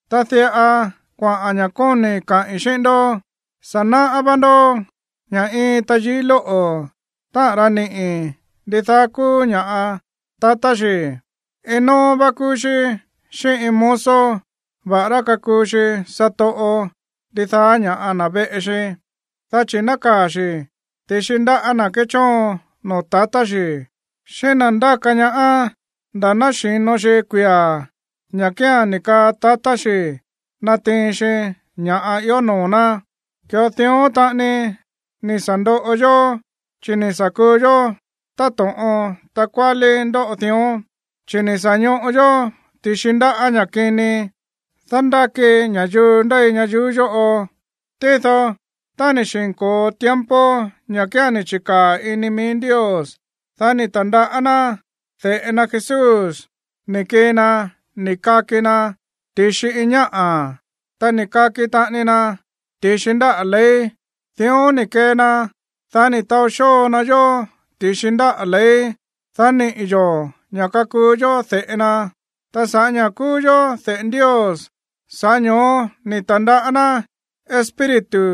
Ta diꞌa kuaꞌa̱n ña̱ kóni̱i̱ kaꞌi̱n xíꞌín ndó. Sa̱ náꞌá vá ndó ña̱ iin tayií lóꞌo̱, táꞌa̱n ra niꞌi̱ ndidaá kúú ña̱ꞌa tatá xi̱, iin nóó vá kúú xí xíꞌín iin mozo, va̱ꞌará kakuu xi satoꞌo ndidaá ña̱ꞌa na̱ veꞌe xi. Dá chi̱ nákaa̱ xi̱ ti̱xi ndáꞌa̱ na̱ kéchóon noo̱ tatá xi̱ xíꞌín na̱ ndáka ñaá nda̱ ná xi̱no xi kuia̱ ña̱ kía̱n ni̱ kaa tatá xi̱ natiin xi ña̱ꞌa ió noo̱ ná. Ki̱ꞌo dión taꞌani ni̱ sa̱ ndoꞌo yó, chi̱ ni̱ sa̱ kuu yó táto̱ꞌon takuálí ndóꞌo dión, chi̱ ni̱ sa̱ ñoꞌo yó ti̱xi ndáꞌa̱ ña̱ kini dándáki ña̱yuu ndéi ñayuú yóꞌo. Tído tá ni̱ xi̱nko̱o tiempo ña̱ kía̱n ni̱ chi̱kaa̱ ini mií Ndios, dá ni̱ ta̱ndaꞌá ná de̱ꞌe na Jesús ni̱ kii na ni̱ kaki na ti̱xi iin ñáꞌa̱. Ta ni̱ kaki taꞌani na ti̱xi ndáꞌa̱ ley. Dión ni̱ kee na, dá ni̱ taó xóo na yó ti̱xi ndáꞌa̱ ley, dá niꞌi̱ yo̱ ña̱ kakuu yó de̱ꞌe na. Ta sa̱ꞌá ña̱ kúú yó de̱ꞌe Ndios, sa̱ꞌá ño̱ó ni̱ ta̱ndaꞌá ná Espíritu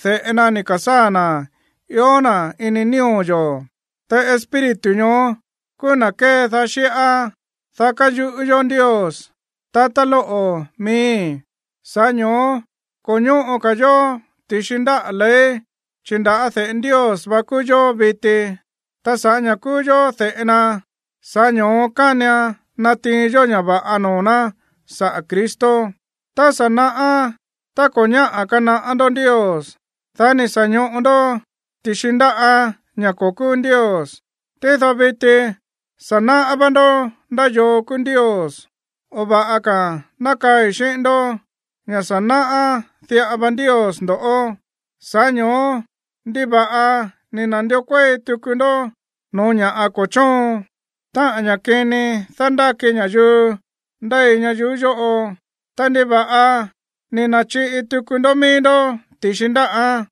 de̱ꞌe na ni̱ ka̱sáa̱ na̱ ió na̱ ini nío̱ yo̱. Ta Espíritu ñoó kúú na̱ kédaá xíꞌá, dá kayuꞌú yó Ndios: “Tatá lóꞌo̱ miíi̱.” Sa̱ꞌá ño̱ó ko̱ ñóꞌo ka̱ yo̱ ti̱xi ndáꞌa̱ ley, chi̱ nda̱á de̱ꞌe Ndios vá kúú yó viti. Ta sa̱ꞌá ña̱ kúú yó de̱ꞌe na, sa̱ꞌá ño̱ó kánian natiin yó ña̱ va̱ꞌa noo̱ ná saꞌa̱ Cristo. Tá sa̱ naꞌá, ta ko̱ ñáꞌa̱ kanaꞌá ndó Ndios, dá ni̱ sa̱ ñoꞌo ndó ti̱xi ndaꞌá ña̱ ko̱ kúú ndios. Tído viti sa̱ náꞌá vá ndó ndá yoo kúú Ndios, o va̱ꞌa ka̱a̱n ná kaꞌi̱n xíꞌín ndó ña̱ sa̱ náꞌá diꞌa va Ndios ndo̱ꞌó. Sa̱ꞌá ño̱ó, ¿ndiva̱ꞌa ni̱ na̱ndió kuéi tuku ndó no̱ó ña̱ꞌa ko̱ chóon, táꞌa̱n ña̱ kini dándáki ña̱yuu ndéi ñayuú yóꞌo? Ta, ¿ndiva̱ꞌa ni̱ na̱chiꞌi tuku ndó mií ndó ti̱xi ndáꞌán?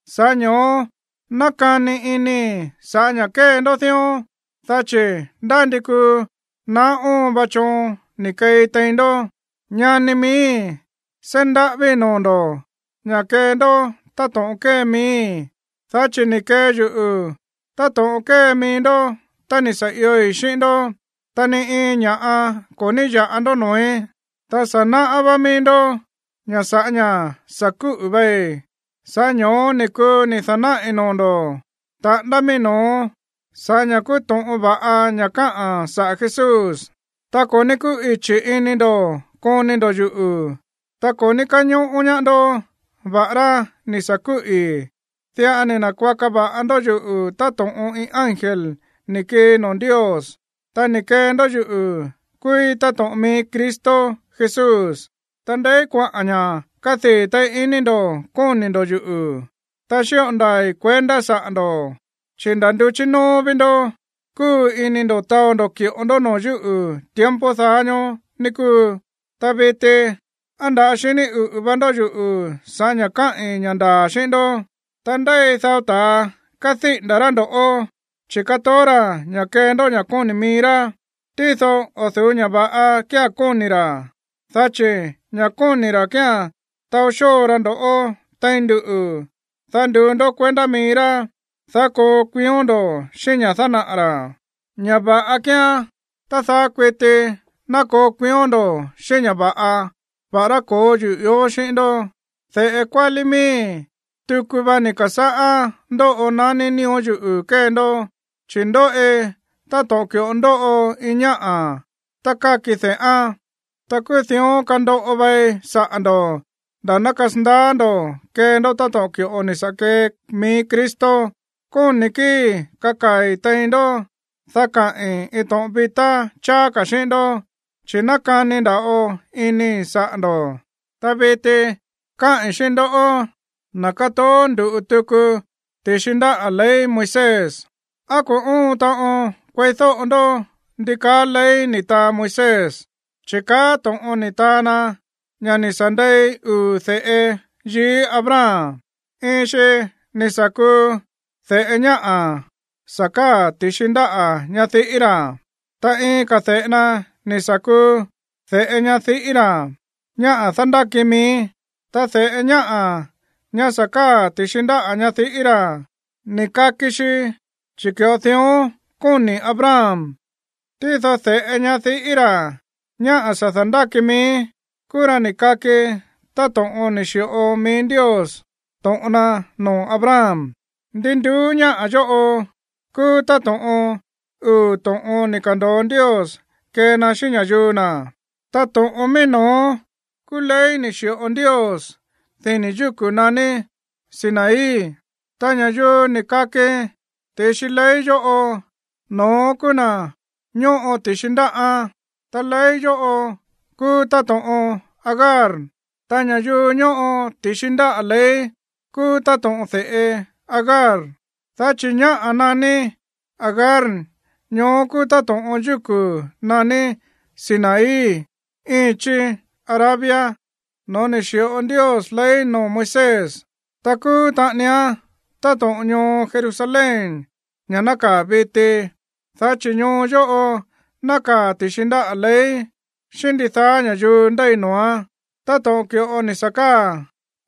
Sa̱ꞌá ño̱ó nákani inii̱ sa̱ꞌá ña̱ kée ndó dión, dá chi̱ ndá ndi kuu naá óon va choon ni̱ keei tein ndó. Ñani miíi̱, seí ndaꞌávíi̱ noo̱ ndo̱ ña̱ kee ndó táto̱ꞌon kée miíi̱, dá chi̱ ni̱ kee yuꞌu̱ táto̱ꞌon kée mií ndó tá ni̱ sa̱ ioi̱ xíꞌín ndó. Ta ni iin ña̱ꞌa ko̱ ní ya̱ꞌa ndó noo̱í. Ta sa̱ náꞌá vá míí ndó ña̱ sa̱ꞌá ña̱ sa̱ kúꞌu̱ vai, sa̱ꞌá ño̱ó ni̱ kuu ni̱ da̱náꞌi̱ noo̱ ndo̱ taꞌándá míí no̱ó sa̱ꞌá ña̱ kúú to̱ꞌon va̱ꞌa ña̱ káꞌa̱n saꞌa̱ Jesús. Ta ko̱ ní kúꞌichi̱ ini ndo̱ koni ndo̱ yuꞌu̱, ta ko̱ ní káñóꞌó ñaá ndó va̱ꞌará ni̱ sa̱ kúꞌi̱. Diꞌa ni̱ na̱kuaka va̱ꞌa ndó yuꞌu̱ táto̱ꞌon iin ángel ni̱ kii noo̱ Ndios, ta ni̱ kee ndó yuꞌu̱ kúúí táto̱ꞌon mií Cristo Jesús. Ta, ¿ndeí kuaꞌa̱n ña̱ kádii̱ téí iní ndo̱ koni ndo̱ yuꞌu̱? Ta xíꞌo ndaa̱i̱ kuendá saꞌa̱ ndo̱, chi̱ nda̱ nduchí nóó ví ndó kúꞌu̱ ini ndo̱ taó ndo̱ ki̱ꞌo ndó noo̱ yúꞌu̱ tiempo daá ñóó, ní kúu. Ta viti, ¿á nda̱á xiní uꞌu̱ va ndó yuꞌu̱ sa̱ꞌá ña̱ káꞌi̱n ña̱ ndaa̱ xíꞌín ndó? Ta ndéi dao ta̱a kádíꞌi̱nda̱ rá ndo̱ꞌó, chi̱ kátoó ra̱ ña̱ kee ndó ña̱ kóni̱ mií rá, tído o̱ du̱ú ña̱ va̱ꞌa kía̱n kóni̱ ra̱. Dá chi̱ ña̱ kóni̱ ra̱ kía̱n taó xóo ra ndo̱ꞌó tein nduꞌu̱, dá nduu ndó kuendá mií rá, dá koo kuión ndo̱ xíꞌín ña̱ dánaꞌa̱ ra̱. Ña̱ va̱ꞌa kíán tá daá kuití ná koo kuión ndo̱ xíꞌín ña̱ va̱ꞌa, va̱ꞌará ko̱ó yuꞌu̱ ió xíꞌín ndó. De̱ꞌe kuálí miíi̱, tuku va ni̱ ka̱sáꞌá ndóꞌo naní nío̱ yuꞌu̱ kée ndó, chi̱ ndóꞌi táto̱ꞌon ki̱ꞌo ndóꞌo iin ñáꞌa̱ tá káki de̱ꞌán. Ta kúú dión kandoꞌo vai saꞌa̱ ndo̱ nda̱ ná kasandaá ndo̱ kee ndó to̱ꞌon ki̱ꞌo ni̱ sa̱ kee mií Cristo. Kóni̱ kíi̱i̱ kakaa̱i̱ tein ndó, dá kaꞌi̱n iin to̱ꞌon vitá cháá ka̱ xíꞌín ndó, chi̱ nákani nda̱ꞌo inii̱ saꞌa̱ ndo̱. Ta viti káꞌi̱n xíꞌín ndoꞌó, na̱ kátoó ndu̱ꞌu tuku ti̱xi ndáꞌa̱ ley Moisés: ¿á ko̱ óon taꞌon kueídóꞌo ndó ndi kaá ley ni̱ taa Moisés? Chi̱ kaá to̱ꞌon ni̱ taa na ña̱ ni̱ sa̱ ndei uu̱ de̱ꞌe yií Abraham. Iin xi ni̱ sa̱ kuu de̱ꞌe ñáꞌa̱ sa̱ káa̱ ti̱xi ndáꞌa̱ ñadiꞌí na̱. Ta iin ka̱ de̱ꞌe na ni̱ sa̱ kuu de̱ꞌe ñadiꞌí na̱, ñáꞌa̱ dándáki mií. Ta de̱ꞌe ñáꞌa̱, ña̱ sa̱ káa̱ ti̱xi ndáꞌa̱ ñadiꞌí na̱, ni̱ kaki xi chi̱ ki̱ꞌo dión kóni̱ Abraham. Tído de̱ꞌe ñadiꞌí na̱, ñáꞌa̱ dándáki mií, kúú ra ni̱ kaki táto̱ꞌon ni̱ xi̱ꞌo mií Ndios to̱ꞌon na noo̱ Abraham. Ndi nduú ñáꞌa̱ yóꞌo kúú táto̱ꞌon uu̱ to̱ꞌon ni̱ ka̱ndo̱o Ndios kee na xíꞌín ña̱yuu na̱. Ta to̱ꞌon mií no̱ó kúú ley ni̱ xi̱ꞌo Ndios dini̱ yúku̱ naní Sinaí. Ta ña̱yuu ni̱ kaki ti̱xi ley yóꞌo, no̱ón kúú na̱ ñóꞌo ti̱xi ndáꞌán. Ta ley yóꞌo kúú táto̱ꞌon Agar, ta ña̱yuu ñóꞌo ti̱xi ndáꞌa̱ ley kúú táto̱ꞌon de̱ꞌe Agar. Dá chi̱ ñáꞌa̱ naní Agar ñoó kúú táto̱ꞌon yúku̱ naní Sinaí íin chí Arabia no̱ó ni̱ xi̱ꞌo Ndios ley noo̱ Moisés. Ta kúú taꞌanián táto̱ꞌon ñoo Jerusalén, ña̱ nákaa̱ viti. Dá chi̱ ñoo yóꞌo nákaa̱ ti̱xi ndáꞌa̱ ley xíꞌín ndidaá ña̱yuu ndéi noo̱án, táto̱ꞌon ki̱ꞌo ni̱ sa̱ káa̱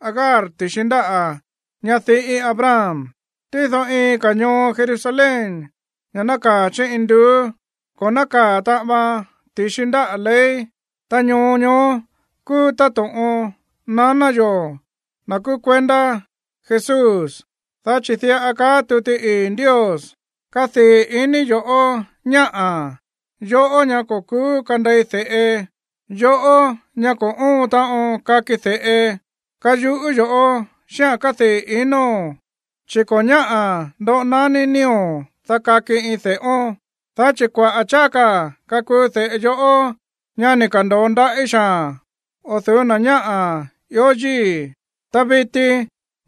Agar ti̱xi ndáꞌa̱ ñadiꞌí Abraham. Tído iin ka̱ ñoo Jerusalén, ña̱ nákaa̱ chí induú, ko̱ nákaa̱ taꞌan vaan ti̱xi ndáꞌa̱ ley. Ta ñoo ñoó kúú táto̱ꞌon naná yo̱, na̱ kúú kuendá Jesús. Dá chi̱ diꞌa kaá tuti ii̱ Ndios: Kadii̱ iní yo̱ꞌó, ñáꞌa̱, yoꞌó ñá ko̱ ku̱ú kandei de̱ꞌe, yoꞌó, ñá ko̱ óon taꞌon kaki de̱ꞌe. Kayuꞌú yoꞌó xíꞌa̱n kádii̱ inóo̱n, chi̱ ko̱ ñáꞌa̱ ndoꞌo naní nío̱, dá kaki iin de̱ꞌón. Dá chi̱ kuaꞌa̱ cháá ka̱ kakuu de̱ꞌe yoꞌó, ñá ni̱ ka̱ndo̱o ndaꞌí xaa̱n, o̱ du̱ú na̱ ñáꞌa̱ ió yíi̱. Ta viti,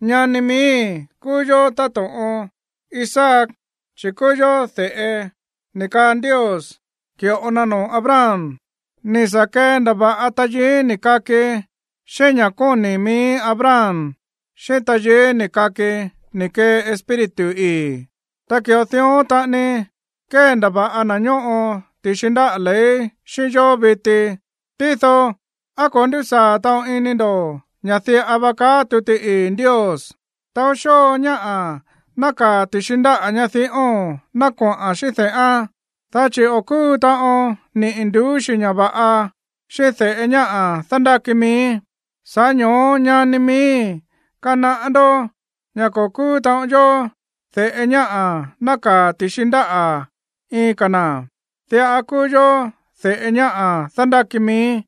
ñani miíi̱, kúú yó táto̱ꞌon Isaac, chi̱ kúú yó de̱ꞌe ni̱ kaa Ndios ki̱ꞌo na noo̱ Abraham. Ni̱ sa̱ kendava̱ꞌa tayií ni̱ kaki xíꞌín ña̱ kóni̱ míí Abraham xíꞌín tayií ni̱ kaki ni̱ kee Espíritu ii̱. Ta ki̱ꞌo dión taꞌani kéndava̱ꞌa na̱ ñóꞌo ti̱xi ndáꞌa̱ ley xíꞌín yó viti. Tído, ¿á ko̱ ndúsaa̱ taꞌon ini ndo̱ ña̱ káꞌa̱n tuti ii̱ Ndios? Chi̱ diꞌa va kaáa̱n: “Taó xóo ñáꞌa̱ nákaa̱ ti̱xi ndáꞌa̱ ñadiꞌóo̱n ná koꞌa̱n xíꞌín de̱ꞌán. Dá chi̱ o̱ kúu taꞌon niꞌi̱ nduú xi̱ ña̱ va̱ꞌa xíꞌín de̱ꞌe ñáꞌa̱ dándáki mií.” Sa̱ꞌá ño̱ó, ñani miíi̱, kanaꞌá ndó ña̱ ko̱ kúú taꞌon yó de̱ꞌe ñáꞌa̱ nákaa̱ ti̱xi ndáꞌa̱ iin ka̱ na̱. Diꞌa kúú yó de̱ꞌe ñáꞌa̱ dándáki mií.